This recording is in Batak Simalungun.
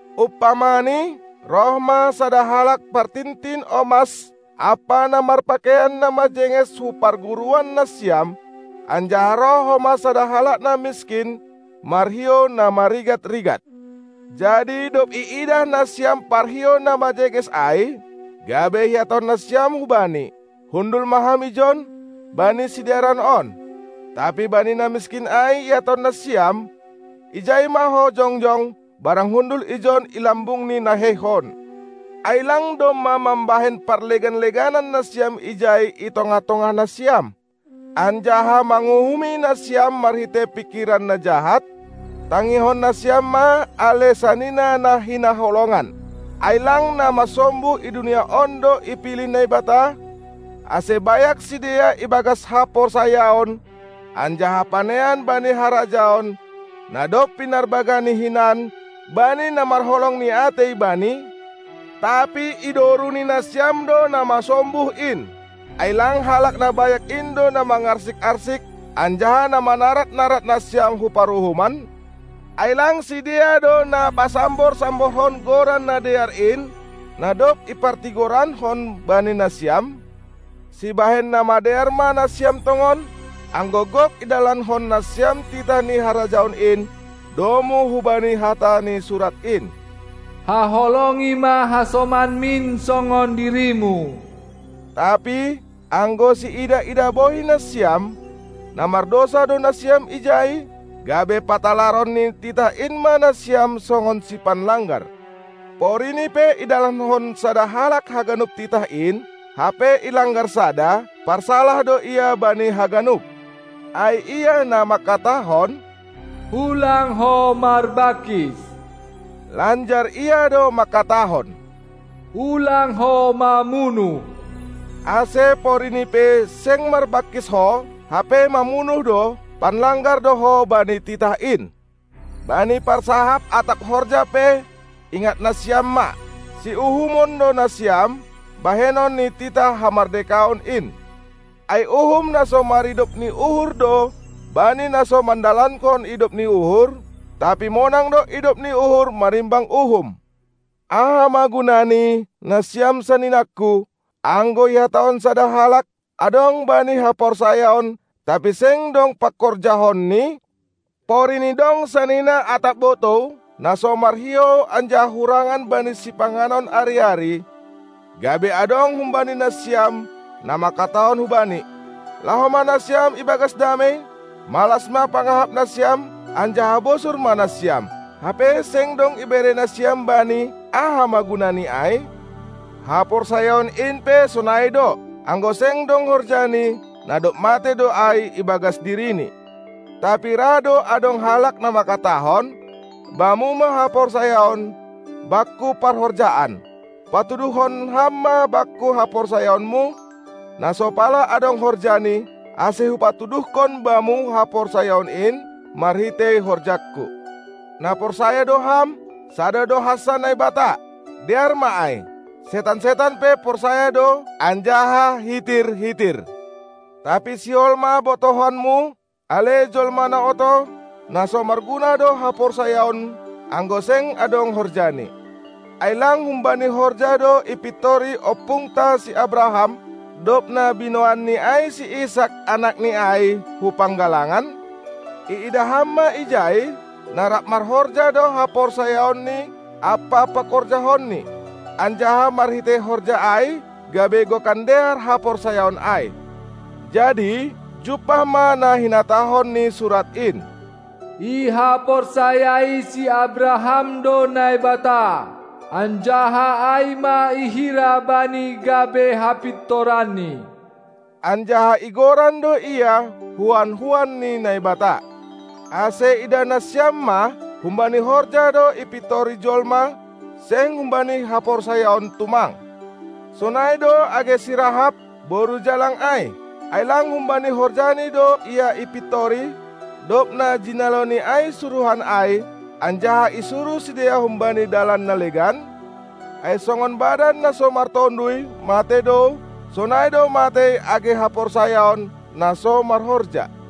Umpamani, roh ma sada halak partintin omas ampa na marpakeian na majenges hu parguruan nasiam, anjaha roh homa sada halak na miskin marhiou na marigat-rigat. Jadi dob iidah nasiam parhiou na majenges ai, gabe ihatahon nasiam hubani: "Hundul ma ham ijon, bani sidearan on," tapi bani na miskin ai ihatahon nasiam: "Ijai ma ho jongjong barang hundul ijon i lambung ni naheihon," ai lang domma mambahen parlegan-leganan nasiam ijai i tongah-tongah nasiam, anjaha manguhumi nasiam marhitei pingkiran na jahat? Tangihon nasiam ma, ale sanina na hinaholongan: Ai lang na masombuh i dunia on do ipilih Naibata, ase bayak sidea ibagas haporsayaon anjaha panean bani harajaon, na dob pinarbagahNi hinan bani na marholong ni atei Bani? Tapi idoruni nasiam do na masombuh in. Ai lang halak na bayak in do na mangarsik-arsik anjaha na manarad-narad nasiam hu paruhuman? Ai lang sidea do na pasambor-samborhon Goran na dear in, na dob ipartigorankon bani nasiam? Sibahen na madear ma nasiam tongon, anggo gok idalankon nasiam titah ni Harajaon in, domu hubani hata ni Surat in: Haholongi ma hasomanmin songon dirimu! Tapi, anggo siidah-idah bohi nasiam, na mardousa do nasiam ijai, gabe patalaron ni titah in ma nasiam songon sipanlanggar. Porini pe idalankon sada halak haganup titah in, hape ilanggar sada, parsalah do ia bani haganup. Ai Ia na mangkatahon: "Ulang ho marbangkis!" lanjar Ia do mangkatahon: "Ulang ho mamunuh!" Ase pori ni pe seng marbangkis ho, hape mamunuh do, panlanggar do ho bani titah in. Bani parsahap atap horja pe ingat nasiam ma: Siuhumon do nasiam bahenon ni titah hamardekaon in. Ai uhum na so maridop ni uhur do bani na so mandalankon idop ni uhur, tapi monang do idop ni uhur marimbang uhum. Aha ma gunani, nasiam saninangku, anggo ihatahon sada halak, adong bani haporsayaon, tapi seng dong pangkorjahonni? Porini dong sanina atap botou, na so marhiou anjaha hurangan bani sipanganon ari-ari, gabe adong humbani nasiam, na mangkatahon hubani: "Laho ma nasiam ibagas damei, malas ma pangahap nasiam anjaha bosur ma nasiam," hape seng dong ibere nasiam bani, aha ma gunani ai? Haporsayaon in pe sonai do. Anggo seng dong horjani, na dob matei do ai ibagas dirini. Tapi ra do adong halak na mangkatahon: Bamu ma haporsayaon, bakku parhorjaan! Patuduhkon ham ma bakku haporsayaonmu, na so pala adong horjani, ase hupatuduhkon bamu haporsayaon in marhitei horjangku. Na porsaya do ham: Sada do hansa Naibata. Dear ma ai. Setan-setan pe porsaya do anjaha hitir-hitir. Tapi sihol ma botohonmu, ale jolma na oto, na so marguna do haporsayaon, anggo seng adong horjani. Ai lang humbani horja do ipintori ompungta si Abraham, dob na binoanni ai si Isak, anakni ai, hu panggalangan? Iidah ham ma ijai, na rap marhorja do haporsayaonni ampa pangkorjahonni, anjaha marhitei horja ai gabe gokan dear haporsayaon ai. Jadi jumpah ma na hinatahon ni Surat in: Ihaporsayai si Abraham do Naibata, anjaha ai ma ihira bani gabe hapintoranni, anjaha igoran do ia "huan-huan ni Naibata". Ase idah nasiam ma: Humbani horja do ipintori jolma, seng humbani haporsayaon tumang. Sonai do age si Rahab, boru jalang ai, ai lang humbani horjani do ia ipintori, dob na jinaloni ai suruhan ai, anjaha isuruh sidea humbani dalan na legan? Ai songon badan, na so martonduy, matei do, sonai do matei age haporsayaon, na so marhorja.